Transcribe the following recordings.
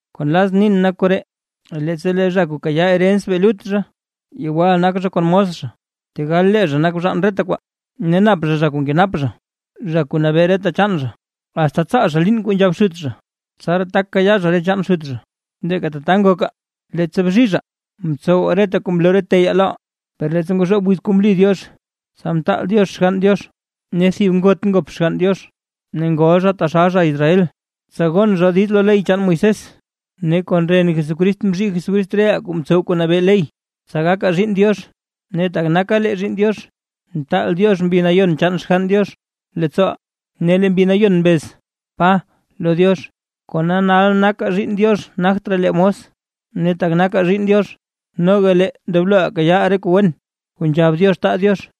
Kuu nlazʼn nin nak koree: Leettsa lee zha kuu kayaa herens bee lut zha, yewal nak zha kon mos zha, tegal lee zha nak bzhaan reta kwaa. Ne nap zha, zha kuu nkenap zha, zha kuu nabee reta chaan zha, asta tsaal zha liin kuu nzhab xut zha, tsaraa tak kayaa zha re chaan xut zha. Leeka tata ngokaa, leettsa bzhizhaa, mtsowaa reta kuu mloo re teyaa loʼaa. Per leettsa ngozhoob wiz kuu mli Diox, tsa mtaal Diox Xgann Diox, ne thib ngot ngop Xgann Diox; ne ngol zha taxal zha Israel, tsa gon zha diiz lo ley chaan Moisés. Ne kon ren Jesucrist mzhii Jesucrist reʼaa kuu mtsow re kuu nabee ley, tsa gakaa zhiinn Diox. Ne tak naka lee zhiinn Diox, mtaal Diox Mbi Nayon chaan Xgann Diox leettsooʼaa; ne lee Mbi Nayon mbez: “¡Pa!” lo Diox. Kona nal nakaa zhiinn Diox ne nagt raa lee mos. Ne tak nakaa zhiinn Diox, noga lee ndobloʼaa kayaaʼaa re kuu wen kuu nzhab Diox taa Diox.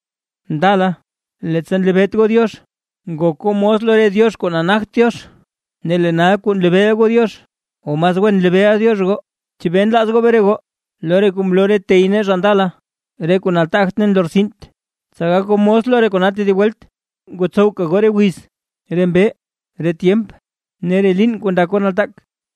Ndala, leettsa nlebeet goo Diox, ngok goo mos lo re diox kuu nagt Diox. Ne lee nal kuu nlebeeʼa goo Diox o mas wen nlebeeʼa Diox goo, ¿chebee nlaaz goo bre goo lo re kuu mloo re tey nee zha ndala, re kuu nataagt ne nlortsint, tsa gak goo mos lo re kona tedib welt? Tak ngotsowka goo re wiz, re mbee, re tyemp ne re liin kuu ndak goo nataak.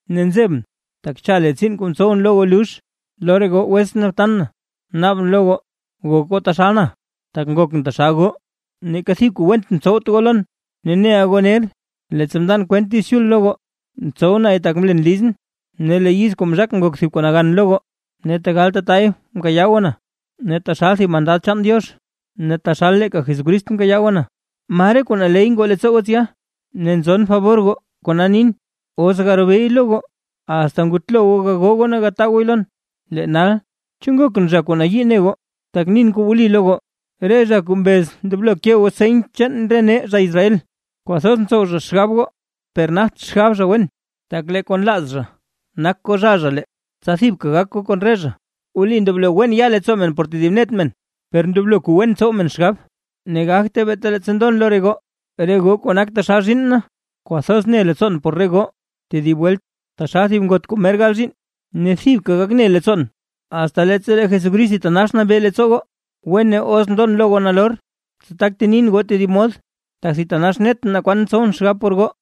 Ne nzebʼn, tak cha lee tsiin kuu mtsowʼn lo goo lux. Lo re goo wetsʼn ne btan na, naabʼn lo goo, gok goo taxal na, tak ngokʼn taxal goo. Neeka thib kuu went mtsowt goo lon, ne neʼa goo ner, leettsa mndan kwent Diiz Chul lo goo, mtsow nay tak mlen lizʼn. Ne lee yiz kuu mzhakʼn ngok thib kuu nagan lo goo, ne tegal tatay mkayaa goo na. Ne taxal thib mandad chaan Diox ne taxal leeka Jesucrist mkayaa goo na. ¿Ma re kuu naley ngoo leettsoo goo tsya? Ne nzon fabor goo kona nin, os garobeey lo goo, asta ngutlo goo gagoo goo ne gataa gooy lon. Lee nal, ¿chu nakʼn zha kuu nayii ne goo, takʼn nin kuu wli lo goo? Re zha kuu mbez ndoblo ke goo seny chaan nee zha Israel, kwathoz ntsow zha xgab goo, per nagt xgab zha wen, tak lee kuu nlaaz zha nak kozhaa zha lee, tsa thibka gak goo kon re zha. Wli, wen ndoblo ya leettsoo men por tedib net zha, per ndoblo kuu wen tsow men xgab; ne gagte beeta leettsa ndon lo re goo. Re goo kuu nak taxal zhiinn na, kwathoz ne leettsoon por re goo tedib welt, taxal thib ngot kuu mer gal zhiinn ne thibka gak ne leettsoon, asta leettsa lee Jesucrist thitanax nabee leettsoo goo. ¡Wene os ndon lo goo nalor, tsa tak nin lo goo tedib mod, tak thitanax netʼn naa kwan tsowʼn xgab por goo!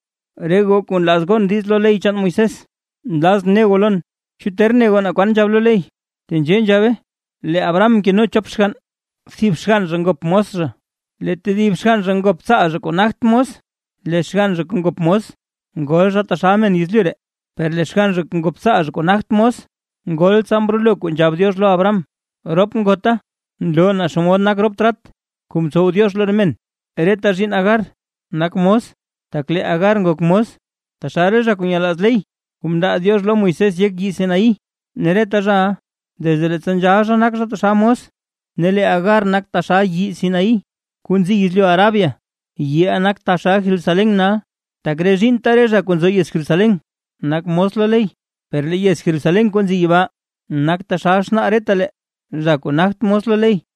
Re goo kuu nlaaz gon diiz lo ley chaan Moisés, nlazʼn ne goo lon; ¿chu ter ne goo naa kwan nzhab lo ley? Tenzhee nzhabe, lee Abraham mkeno chop xgann; thib xgann zha ngop mos zha lee tedib xgann zha ngop tsaal zha kuu nagt mos. Lee xgann zha kuu ngop mos, ngol zha taxal men yezlyu ree, per lee xgann zha kuu ngop tsaal zha kuu nagt mos, ngol tsa mrolo kuu nzhab Diox lo Abraham. Rop ngota nloo naa xomod nak rop trat kuu mtsow Diox lo re men: Reta zhiinn Agar nak mos, tak lee Agar ngok mos, taxal re zha kuu nyelaaz ley kuu mndaa Diox lo Moisés yek yii Sinaí. Ne reta zhaʼa, desde leettsa nzhal zha nak zha taxal mos. Ne lee Agar nak taxal yii Sinaí kuu nzi yezlyu Arabia, yiʼa nak taxal Jerusalén nal, tak re zhiinnta re zha kuu nzo yez Jerusalén nak mos lo ley. Per lee yez Jerusalén kuu nzi yibaa, nak taxal xnaa retalee, zha kuu nagt mos lo ley.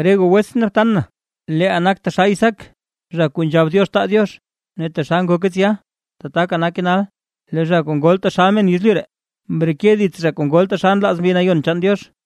Re goo wetsʼn ne btan na, leeʼaa nakaa taxal Isaac; zha kuu nzhab Diox taa Diox. Ne taxal ngoke tsya, tataka nake nal, lee zha kuu ngol taxal men yezlyu ree, mreke dits zha kuu ngol taxal nlaaz Mbi Nayon chaan Diox.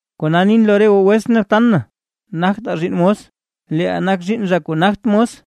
Kona nin lo re goo wetsʼn ne btan na, nagtaa zhiinn mos, leeʼaa nak zhiinn zha kuu nagt mos.